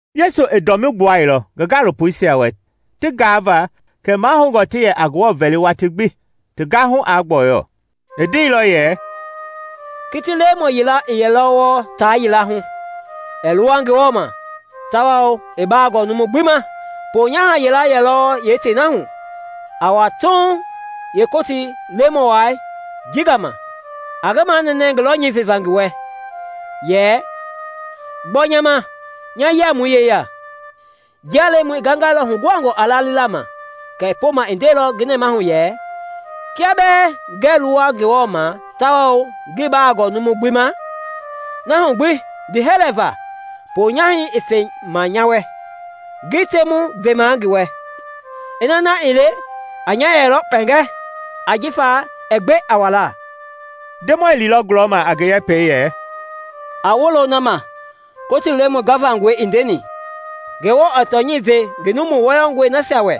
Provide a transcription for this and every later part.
Yesu i dɔmii gbuailɔ ngi gaalopoisia wɛ ti gaava kɛ mahoungɔ ti yɛ a Ngewɔ vɛli watii gbi, ti gahu aa gbɔyɔ. I ndeilɔ yɛ, “Kiti lemɔ yila i yɛlɔ wɔɔ taa yila hu, ɛɛ luwa Ngewɔ ma tawao ii ba gɔɔ numu gbi ma. Ponyaha yila yɛlɔ yeetei na hu, a wa Tuuŋ yeekootii lemɔi ji gama a ngi manɛnɛ ngi lɔnyɛi veva ngi wɛ, yɛ, ‘Gbɔ nya ma nya yiamui yeya!’ Njia lemɔi i gangɛilɔ huguhangɔ a lalila ma kɛɛ poma i ndeilɔ nɛmahu yɛ, ‘Kia bɛɛ ngɛɛ luwa Ngewɔ ma tawao ngii ba gɔɔ numu gbi ma, na hu gbi ndiihɛlɛ va ponyahɛi i fe ma nya wɛ, ngi temu vemaa ngi wɛ, ina na ii le a nya yɛlɔ kpɛngɛ ajifa ɛɛ gbe a walaa.’” Ndemɔi liilɔ gulɔma a ngi yɛpɛi yɛ, “A wolo na ma Kotii lemɔ gavangɔi i ndeni. Ngewɔ ɛɛ tɔnyɛi ve ngi numu wɔyɔngɔi nasia wɛ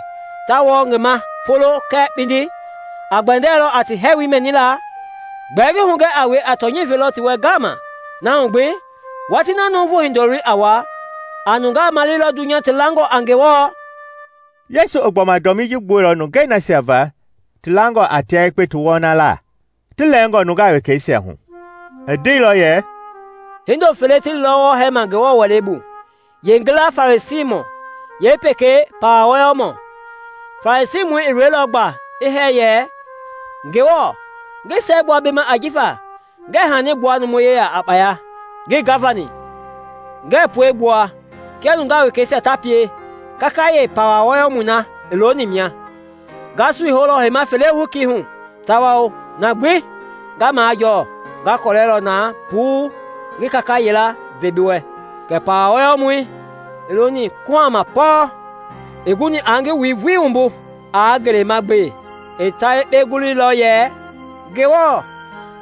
ta wɔɔ ngi ma a folo kɛɛ kpindi? A gbɛndɛlɔ a ti hɛɛwoi mɛnila? Gbɛɛ ngi hugɛ a wue, a tɔnyɛi velɔ ti wɛ ngaama. Na hu gbi, watii na Nuuvu Hindoloi a wa, a nungaa maleilɔ dunya ti langɔ a Ngewɔ?” Yesu i gbɔma dɔmii ji gbuɛilɔ nungei nasia va ti langɔ a tia yekpe ti wɔnalaa, ti lɛɛngɔ nungaa wekeisia hu. I ndeilɔ yɛ, “Hindo fele ti liilɔ wɔɔ hɛɛma Ngewɔ Wɛlei bu, yeengila Farisiimɔ, yeepekei pawa wɔyɔmɔ. Farisiimɔi i loilɔ gba i hɛɛ yɛ, ‘Ngewɔ, ngi siɛgbua bi ma ajifa ngɛɛ hani gbua numu yeya a kpaya, ngii gavani, ngɛɛ pue gbua kia nungaa wekeisia ta pie kakayee pawa wɔyɔmɔi na i looni mia. Nga sui houlɔ heima fele hokii hu tawao na gbi nga majɔɔ nga kɔlɛlɔ na puu ngi kaka yila ve bi wɛ.’ Kɛɛ pawa wɔyɔmɔi, i looni kuhama pɔɔ, ii guni aa ngi wui vulii wumbu aa ngelema gbe; i ta yekpe guluilɔ yɛ, ‘Ngewɔ,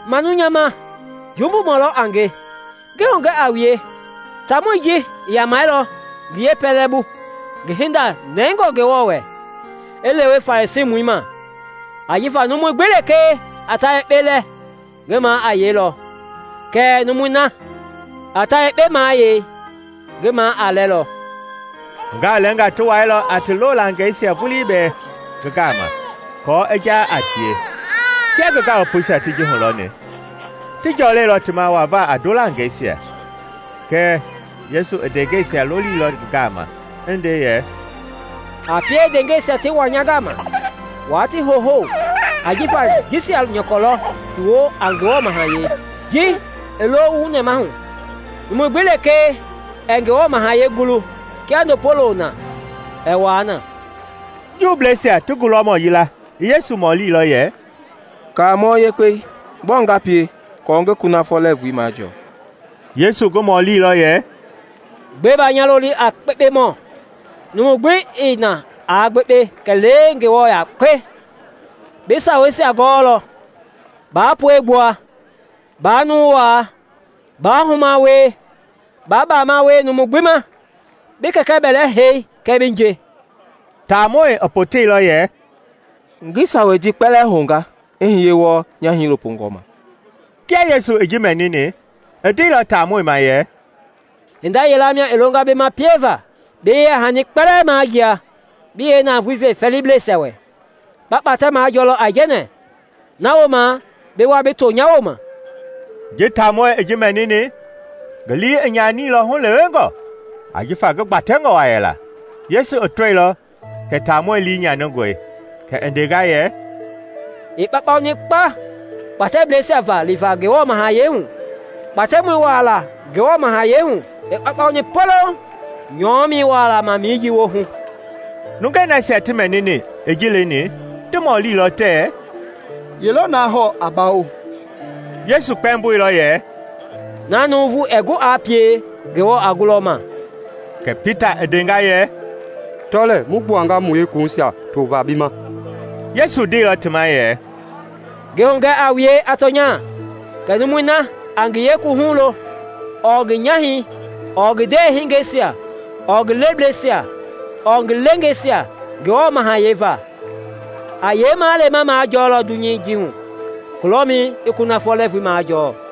manu nya ma, jumbumɔ lɔ a nge!’ Ngi hugɛ a wue, taamɔi ji i yamɛilɔ ngi yeepɛlɛbu ngi hinda nɛngɔ Ngewɔ wɛ, i lewe Farisiimɔi ma. Ajifa numui gbi lekee a ta yekpe lɛ ngi ma a yeilɔ kɛɛ numui na a ta yekpe mayei, ngi ma a lɛlɔ.” Nungaa lɛɛnga ti wailɔ a ti loolangɛisia vulii bɛɛ ngi gama aako i ja a tie. Kia ngi gaalopoisia ti ji hulɔni, ti jɔlɛilɔ ti ma wava a ndolangeisia. Kɛɛ Yesu i ndeengɛisia lolilɔ ngi gama i nde yɛ, “A pie ndeengɛisia ti wa nya gama, wa ti huhou ajifa jisia nyɔkɔ lɔ ti woo a Ngewɔ Mahayɛi. Ji i lo wu nɛmahu! Numu gbi lekee ɛɛ Ngewɔ Mahayɛi gulu kia ndopo wulo na, ɛɛ wua na.” Juubleisia ti gulɔmɔ yila i Yesu mɔlilɔ yɛ, “Kaamɔ Yekpei, gbɔɔ nga pie kɔɔ ngi kunafɔ lɛɛvui majɔɔ?” Yesu ngi mɔlilɔ yɛ, “Gbɛe ba nya loli a kpekpemɔ? Numu gbi ii na aa gbekpe kɛlee Ngewɔ yakpe. Bi saweisia gɔɔlɔ: ‘Baa pue gbua, baa numu waa, baa huma wie, baa baama wie numu gbi ma, bi kɛkɛ bɛlɛ hei kɛɛ bi nje.’” Taamɔi i poteilɔ yɛ, “Ngi sawei ji kpɛlɛɛ hounga i hiye wɔɔ nya hiilopongɔi ma.” Kia Yesu i ji mɛnini, i ndeilɔ taamɔi ma yɛ, “Hinda yila mia i longa bi ma pieva. Bi yeyahani kpɛlɛɛ majia, bi yeenavoei ve fɛɛliblɛisia wɛ, ba kpatɛ majɔlɔ aijɛnɛ; na wooma bi wa bi to nya wooma.” Ji taamɔi i ji mɛnini, ngi lii i nyanilɔ hulewengɔ, ajifa ngi gbatɛngɔ wa yela. Yesu i tɔilɔ kɛ taamɔi lii nyaningɔi, kɛ i ndenga yɛ, “I kpaukpauni kpa kpatɛbleisia va liva Ngewɔ Mahayɛi hu! Kpatɛmɔi wualaa Ngewɔ Mahayɛi hu i kpaukpauni poloŋ nyɔmɛi wualaa ma mijii woohu.” Nungei nasia ti mɛnini i ji leni ti mɔlilɔ tɛɛ, “Ye lɔ na hɔɔ a bawo?” Yesu kpɛmboilɔ yɛ, “Na nuuvu ɛɛ gu aa pie, Ngewɔ a gulɔ ma.” Kɛ Pita i ndenga yɛ, “Tɔ lɛɛ! Mu gbuanga mu yeekuwuhuisia tovaa bi ma.” Yesu ndeilɔ ti ma yɛ, “Ngi hugɛ a wue a tɔnya kɛ numui na a ngi yeekuwuhu lo ɔɔ ngi nyahɛi ɔɔ ngi ndewehingeisia ɔɔ ngi lebleisia ɔɔ ngi leengeisia Ngewɔ Mahayɛi va a yeemalema majɔlɔ dunyei ji hu, kulɔmɛi i kunafɔ lɛɛvui majɔɔ.”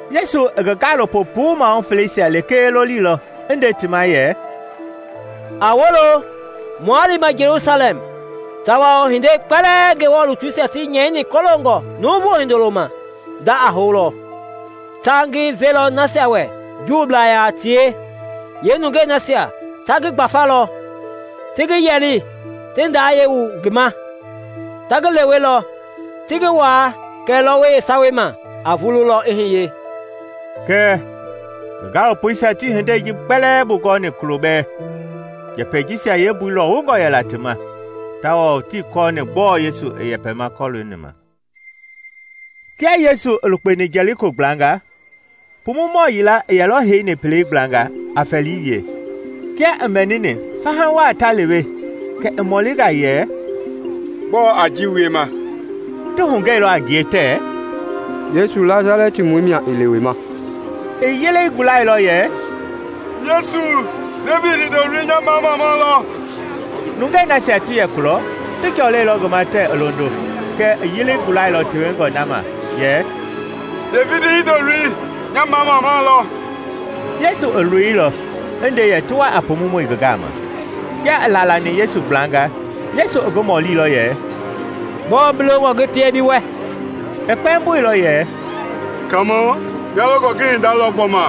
Yesu i ngi gaalopo puu mahu feleisia lekee lolilɔ i nde ti ma yɛ, “A wolo! Mua lima Jelusalɛm, tawao hindei kpɛlɛɛ Ngewɔ lutuisia ti nyɛini kɔloongɔ Nuuvu Hindoloi ma nda a houlɔ. Ta ngi velɔ nasia wɛ Juublaa yaa tie, yeenungei nasia ta ngi gbafalɔ, ti ngi yɛli, ti ndayɛi wu ngi ma. Ta ngi lewelɔ, ti ngi waa kɛɛ lɔwɔi yeesawei ma a vululɔ i hiye.” Kɛɛ ngi gaalopoisia tii hindei ji kpɛlɛɛ bugɔni kulo bɛɛ. Njɛpɛi jisia yeembui lɔwungɔ yɛla ti ma; tawao tii kɔɔni gbɔɔ Yesu i yɛpɛma kɔlooni ma. Kia Yesu i yɛ lukpema Jɛliko gblanga, pumumɔ yila i yɛlɔ heini pelei gblanga, a fɛlii wie. Kia i mɛnini fahii ta lewe kɛ i mɔlinga yɛ, “Gbɔɔ a ji wiema?” Ti hugɛilɔ a ngie tɛɛ, “Yesu Nasalɛtimɔi mia i lewema.” I yelei gulailɔ yɛ, “Yesu, Devidi Hindoloi! Nya mamamau lɔ!” Nungei nasia ti yɛ kulɔ ti jɔlɛilɔ ngi ma tɛɛ i londo. Kɛɛ i yelei gulailɔ tewengɔ na ma yɛ, “Devidi Hindoloi! Nya mamamau lɔ!” Yesu i loilɔ i nde yɛ ti wa a pumumɔi ngi gama. Kia i laalani Yesu gblanga, Yesu i ngi mɔlilɔ yɛ, “Gbɔɔ bi longɔ ngi pie bi wɛ?” I kpɛmboilɔ yɛ, “Kaamɔ, nya longɔ ngi hinda lɔ gbɔma!”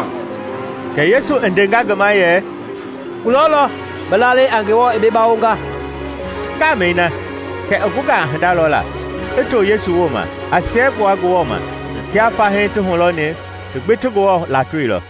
Kɛ yesu i ndenga ngi ma yɛ, “Kulɔ lɔ! Bi lalei a Ngewɔ i bi bawonga.” Ngamɛi na kɛ i gunga a hinda lɔla, i to Yesu wooma, a siɛgbua Ngewɔ ma. Kia fahii ti hulɔni, ti gbi ti Ngewɔ latoilɔ.